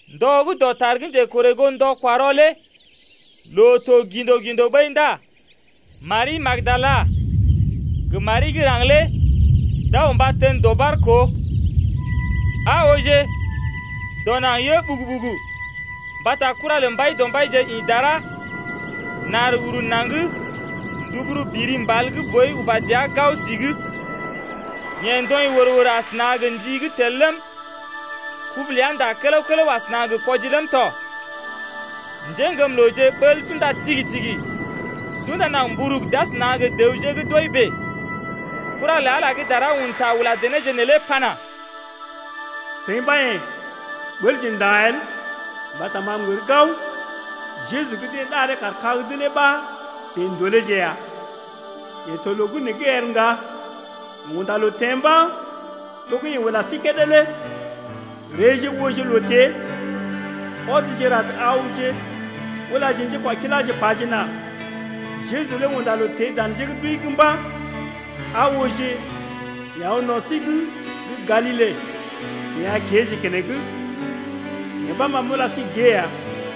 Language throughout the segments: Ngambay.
Ndɔ gə́ dɔtar gə́ njekorè goo ndɔ-kwa-rɔ lé loo to gḭdo-gḭdo ɓəi ndá Mari gə́ Magdala gə Mari gə́ raŋg lé d’aw mba tən dɔɓar koo. Aa ooje, dɔ naŋg yə ɓugu-ɓugu mbata kura lə Mbaidɔmbaije ḭ dara nar uru naŋg nduburu biri mbal gə́ boi uba dəa gao si’g. Yeḛ ndɔḭ wər-wər asəna gə ndi gə́ tel ləm, kubu ləa ndá kələw-kələw asəna gə kwɔji ləm tɔ. Njéŋgəmlooje ɓəl d’unda tigi-tigi d’unda naŋg mburug d’asəna gə dəwje gə́ d’wəi bèe. Kura lə Ala lé gə́ dara un ta ula denéje neelé pana: Seḭ ɓa yḛ̀, ɓəlje nda̰ el mbata ma m’gər gao Jeju gə́ deḛ ɗaree kaar kag’d lé ɓa seḭ ndoleeje ya. Yeḛ to loo gə́ nee’g el ŋga, yeḛ unda loo teḛ mba̰, to gə́ yeḛ ula sí kédé lé. Reeje ooje loo-tée. Ɔdje rad awje ulaje njékwakiláje pajena: Jeju lé unda loo teḛ dan njé gə́ d’wəi’g mba̰. Aa ooje, yeḛ aw no̰ sí’g gə́ Galile, seḭ a kéeje keneŋ. Yee ɓa ma m’ula sí gée ya.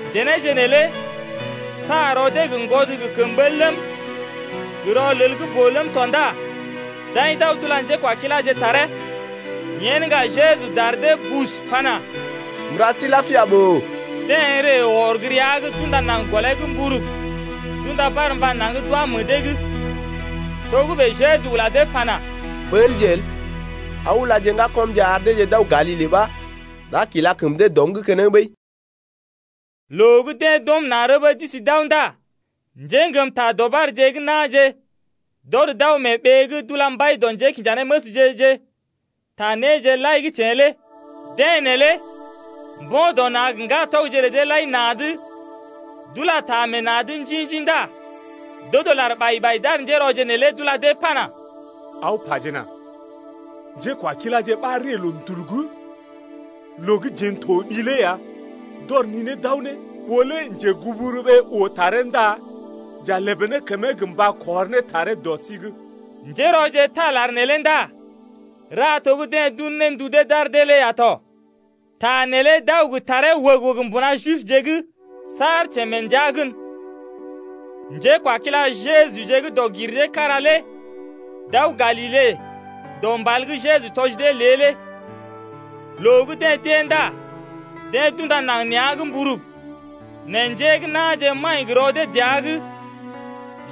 Denéje neelé sa rɔ dee gə ŋgwɔd gə kəm ɓəl ləm, gə rɔlel gə́ boo ləm tɔ ndá d’aḭ d’aw d’ula njékwakiláje taree. Yen ŋga Jeju dar dee bus pana: M’ra sí lapia ɓòo. Deḛ ree wɔr gə́ rəa’g d’unda naŋg gɔlee’g mburug, d’unda barmba naŋg d’wá meḛ dee’g. Togə́bè Jeju ula dee pana: Ɓəlje el, aw ulaje ŋgakɔmje ar deeje d’aw Galile ɓa d’a kila kəm dee dɔm’g keneŋ ɓəi. Loo gə́ deḛ d’ɔm na̰ rəbə d’isi d’aw ndá njéŋgəm ta dɔɓarje gə́ na̰je d’ɔd d’aw mee ɓee’g d’ula mbai dɔ njékinjanéməsje-je ta néje lai gə́ teḛ lé. Deḛ neelé mbo̰ dɔ na̰ gə ŋgatɔgje lə deḛ lai na̰’d, d’ula ta meḛ na̰’d njḭ-njḭ ndá d’odo lar ɓai-ɓai d’ar njérɔje neelé d’ula dee pana: Aw pajena: Njékwakiláje ɓa ree loondul’g loo gə́ jeḛ n’toɓi lé ya, d’ɔr ninee d’aw ne. Ɓó lé njeguburuɓee oo taree ndá j’a lèbè ne kəmee gə mba kɔr ne taree dɔ sí’g. Njérɔje taa lar neelé ndá ra to gə́ deḛ d’un ne ndu dee d’ar dee lé ya tɔ. Ta neelé d’aw gə taree wəg-wəg mbuna Jibje’g saar teḛ mee ndəa gən. Njékwakila Jejuje gə́ dɔg-gir-dee-kára lé d’aw Galile dɔ mbal gə́ Jeju tɔji dee lé. Loo gə́ deḛ d’ée ndá deḛ d’unda naŋg nea̰’g mburug. Nɛ njé gə́ na̰je maḭ gə rɔ dee dəa’g.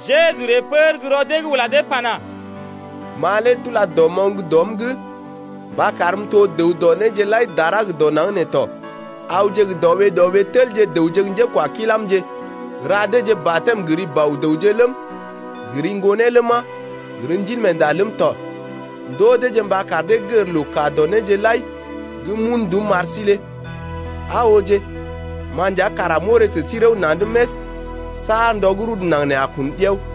Jeju ree pər gə́ rɔ dee’g ula dee pana: Ma lé d’ula dɔmoŋ dɔm’g mba karm m’to dəw dɔ néje lai dara gə dɔ naŋg nee tɔ. Awje gə dɔ ɓee dɔ ɓee telje dəwje gə́ njékwakilamje, raje deeje batɛm gə ri Bɔ-dəwje ləm, gə ri Ŋgonee ləma, gə ri Ndilmeenda ləm tɔ. Ndoo deeje mba kar dee gər loo kaa dɔ néje lai gə́ m’un ndum m’ar sí lé. Aa ooje ma nja kara m’orè sə sí rəw na̰’d més saar ndɔ gə́ rudu naŋg nee a kun ɗiao.